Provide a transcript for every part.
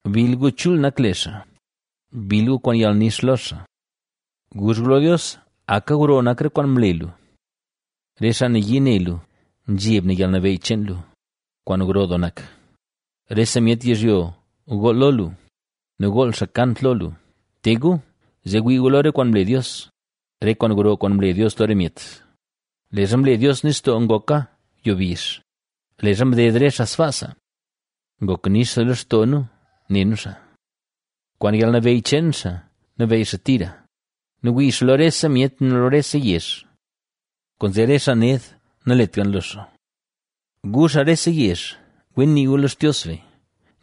Bill gu chul nak le xaa; bill gu kwaan yalnix lo xaa. Guzh gu lo Dios: “¡Aka gro nak re kwaan mle lu! ¡Re xaa nayii ne lu, zheb ne yalnabeyy cheen lu, kwaan gro doo nak!” ¡Rese myet yizhyo gool lo lu nu gool xaa kant lo lu! ¡Te gu, zee wii gu lo re kwaan mle Dios, re kwaan gro kwaan mle Dios lo re myet! Leezha mle Dios nistoo ngoka yo bizh, leezha mded re xaa sbaasa. ¡Ngok nix doo lextoo nu ne nu xaa! Kwaan yalnabeyy cheen xaa, nabeyy xaa tira nu wii xaa lo rese myet nu lo rese yezh, kwaanzee re xaa ned nalet gan lo xaa. ¡Gu, xaa rese yezh, wen nii gu lo Xtios be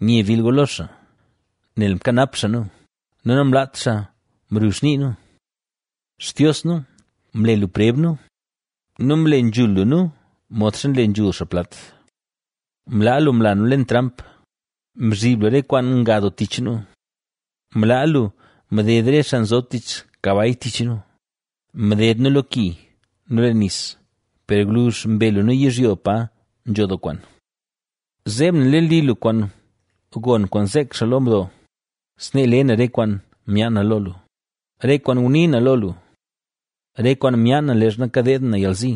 nye bill gu lo xaa! Nel mkanap xaa nu nu namlaat xaa mruzh nii nu. Xtios nu, mle lu preb nu nu mle nzhul lu nu modxa nle nzhul xaa plat. Mlaa lu mla nu leen tramp; mzhib lu re kwaan nga doo tich nu. Mlaa lu mded re xaa nzob tich kabay tich nu; mded nu lo ki nu leen nis, per gwluzh mbe lu nu yizhyo pa nzho doo kwaan. Zeeb na leen li lu kwaan gon kwaan zeek xaa lo mdo; snee le na re kwaan myaan na lo lu, re kwaan ngunii na lo lu, re kwaan myaan na leezha kadeed na yalzi.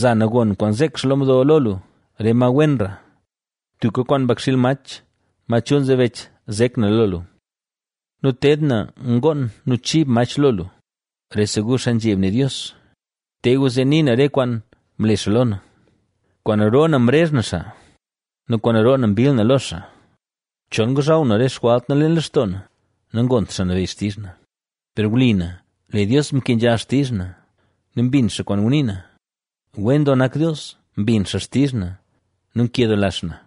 Za na gon kwaan zeek xaa lo mdo lo lu, re ma wenra; tuka kwaan mbakxiil mach, ma chul nzebech zek na lo lu nu ted na ngoon nu chib mach lo lu. Rese gu xaa nzheb ne Dios, te gu zee nii na re kwaan mle xaa lo na. Kwaan roo na mrezh na xaa nu kwaan roo na mbill na lo xaa. Chol ngozhaw na re xjwalt na leen lextoo na, nagont Xaa Nabeyy xtizh na. Per wli na, lee Dios mkenzha xtizh na nu mbin xaa kwaan ngunii na. ¡Wen doo nak Dios, mbin xaa xtizh na nu nkedoola xaa na!